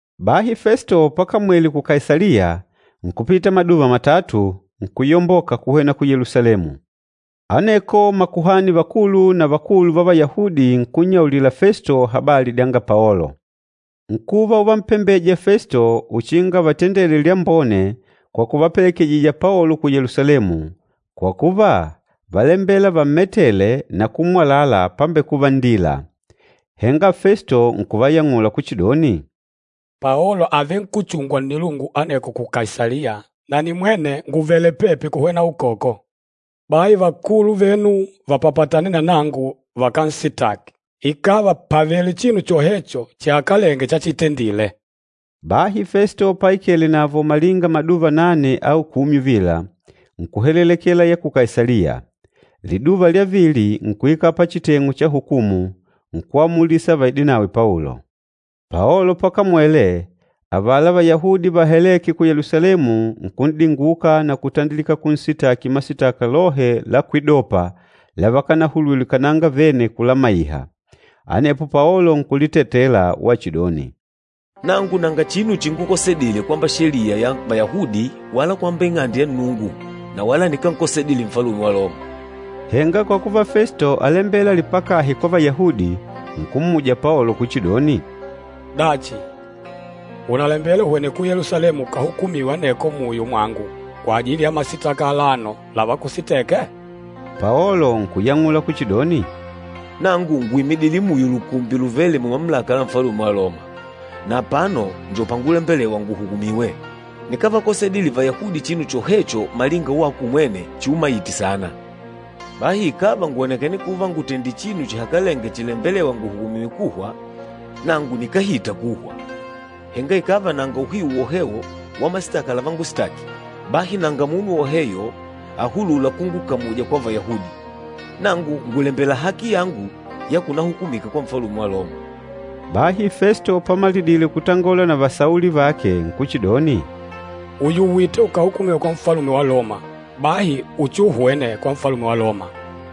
Bahi Festo pakamwele ku Kaisaliya, nkupita maduva matatu, nkuyomboka kuhwena Ku Yelusalemu. Aneko makuhani vakulu na vakulu va Vayahudi nkunnyaulila Festo habali dyanga Paolo. Nkuva uvampembeja Festo uchinga avatendele lyambone kwa kuvapelekejija Paolo ku Yelusalemu, kwa kuva, válembela vammetele na kummwalala pambekuva nndila. Henga Festo nkuvayang'ula kuchidoni, “Paolo àvenkuchungwa nnilungu aneko ku Kaisaliya, na nimwene ngùvele pepi kuhwena ukwoko. Bahi vakulu venu vapapatane na nangu vakansitaki, ikàva pàvele chinu chohecho chihakalenge chachitendile.” Bahi Festo paikele navo malinga maduva nane au kumi uvila, nkuhelelekela ya ku Kaisaliya. Liduva lya vili nkuikala pachiteng'u cha hukumu, nkuamulisa vaidinawe Paolo. Paolo pakamwele, avala Vayahudi vahalêke ku Yelusalemu nkun'dinguka na kutandilika kunsitaki masitaka lohe la kwidopa lavakanahulwile kananga vene kulamaiha. Anepo Paolo nkulitetela wachidoni, “Nangu nanga chinu chingukosedile kwamba sheliya ya Vayahudi wala kwamba Ing'ande ya Nnungu na wala nikánkosedile Nfalume wa Loma.” Henga kwa kuva Festo álembela alipakahe kwa Vayahudi, nkummuja Paolo kuchidoni, “Dachi, ùnalembela uhwene ku Yelusalemu ukahukumiwe aneko muyo mwangu kwajili ya masitaka alano lavakusiteke?” Paolo nkuyang'ula kuchidoni, “Nangu ngùimidile muyo lukumbi luvêle mumamulaka la Nfalume wa Loma, na apano njo pangulembelewa nguhukumiwe. Nikávakosedile Vayahudi chinu chohecho malinga wako umwene chiumaite saana. Bahi ikàva ngwònekene kuva ngùtendile chinu chihakalenge chilembelêwa nguhukumiwe kuhwa, nangu nikáhita kuhwa. Henga ikàva nanga uhiu wohewo wa masitaka lavangusitaki, bahi nanga munu woheyo ahulûla kungukamuja kwa Vayahudi. Nangu ngùlembela haki yangu ya kunahukumiwa kwa Nfalume wa Loma!” Bahi Festo pamalidile kutangola na vasauli vake nkuchidoni, “Ùyuwite ukahukumiwe kwa Nfalume wa Loma, bahi uchiuhwene kwa Nfalume wa Loma.”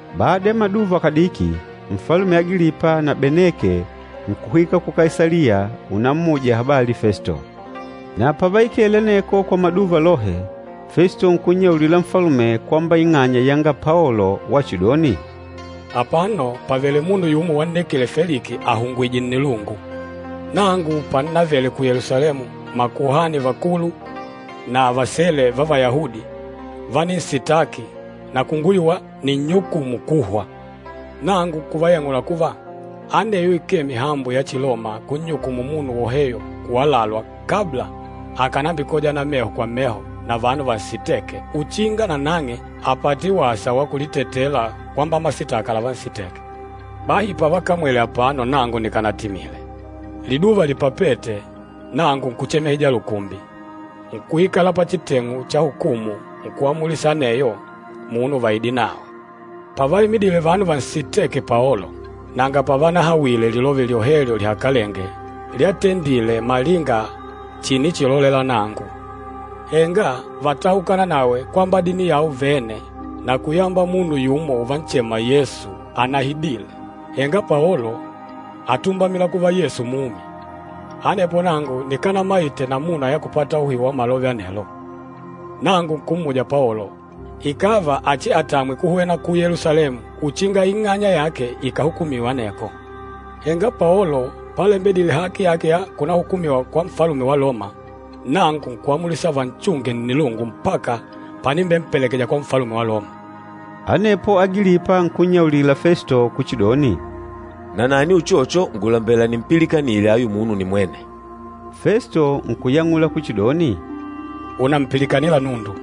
Bada ya maduva kadiki, Nfalume Agilipa na Beneke nkuhwika ku Kaisaliya unammuja habali Festo. Na pavaikele aneko kwa maduva lohe, Festo nkunnyaulila nfalume kwamba ing'anya yanga Paolo wachidoni, “Apano pàvele munu yumo wannekile Feliki ahungwìjè nnilungu. Nangu pannavele ku Yelusalemu, makuhani vakulu na vasele va Vayahudi váninsitaki na kunguyuwa ninnyukumu kuhwa. Nangu nkuvayang'ula kuva, aneyo ikee mihambo ya Chiloma kunnyukumu munu woheyo kuwalalwa kabla akànambikojana meho kwa meho na vanu vansitêke uchinga nanang'e apate wasa wa kulitetela kwamba masitaka lavansiteke. Bahi pavakamwele apano nangu nikanatimile. Liduva lipapête, nangu nkuchemehija lukumbi, nkuikala pachiteng'u cha hukumu nkuamulisa aneyo munu vaide nawe. Pavaimidile vanu vansitêke Paolo, nanga pavanahawile lilove lyohelyo lihakalenge lyatendile malinga chinichilolela nangu. Henga vátahukana nawe kwamba dini yao vene na kuyamba munu yumo uvanchema Yesu anahidile, henga Paolo átumbamila kuva Yesu mumi. Anepo nangu nikanamaite namuna ya kupata uhiu wa malove anelo. Nangu nkummuja Paolo ikàva achiatamwe kuhwena ku Yelusalemu uchinga ing'anya yake ikahukumiwe aneko. Henga Paolo palembedile haki yake ya kunahukumiwa kwa Nfalume wa Loma, nangu nkuamulisa vanchunge nnilungu mpaka panimbempelekeja kwa Nfalume wa Loma.” Anepo Agilipa nkunnyaulila Festo kuchidoni, “Nanani uchocho ngùlambela nimpilikanile ayu munu nimwene.” Festo nkuyang'ula kuchidoni, “Ùnampilikanila nundu.”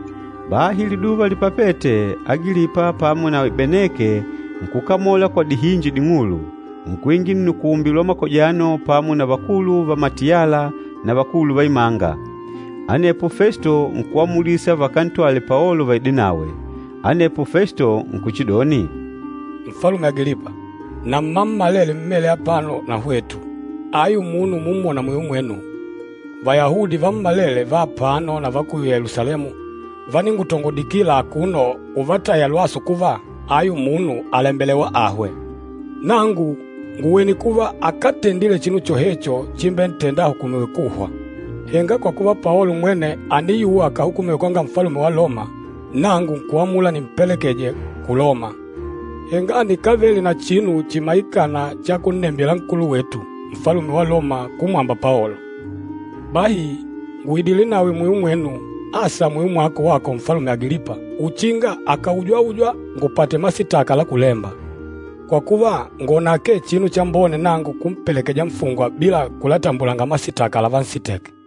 Bahi liduva lipapête, Agilipa pamo nawi Beneke nkukamola kwa dihinji ding'ulu, nkuingila nnukumbi lwa makojano pamo na vakulu va matiyala na vakulu va imanga. Anepo Festo nkuamulisa vakantwale Paolo vaide nawe. Anepo Festo nkuchidoni, “Nfalume Agilipa, na mmammalele mmêle apano na hwetu, ayu munu umumwona muyo mwenu, Vayahudi vammalele va apano na va ku Yelusalemu váningutongodikila akuno uvataya lwasu kuva, ayu munu àlembelewa ahwe. Nangu ngùwene kuva akátendile chinu chohecho chimbentenda ahukumiwe kuhwa. Henga kwa kuva Paolo mwene àniyuwa akahukumiwe kwanga Nfalume wa Loma, nangu nkuamula nimpelekeje ku Loma. Henga nikávele na chinu chimaikâna cha kunnembila nkulu wetu, Nfalume wa Loma kumwamba Paolo. Bahi ngùidile nawe muyo mwenu, asa muyo mwako, wako Nfalume Agilipa uchinga akaujwaujwa ngupate masitaka la kulemba. Kwa kuva, ngwòna akee chinu chambone nangu kumpelekeja nfungwa bila kulatambulanga masitaka lavansiteke.”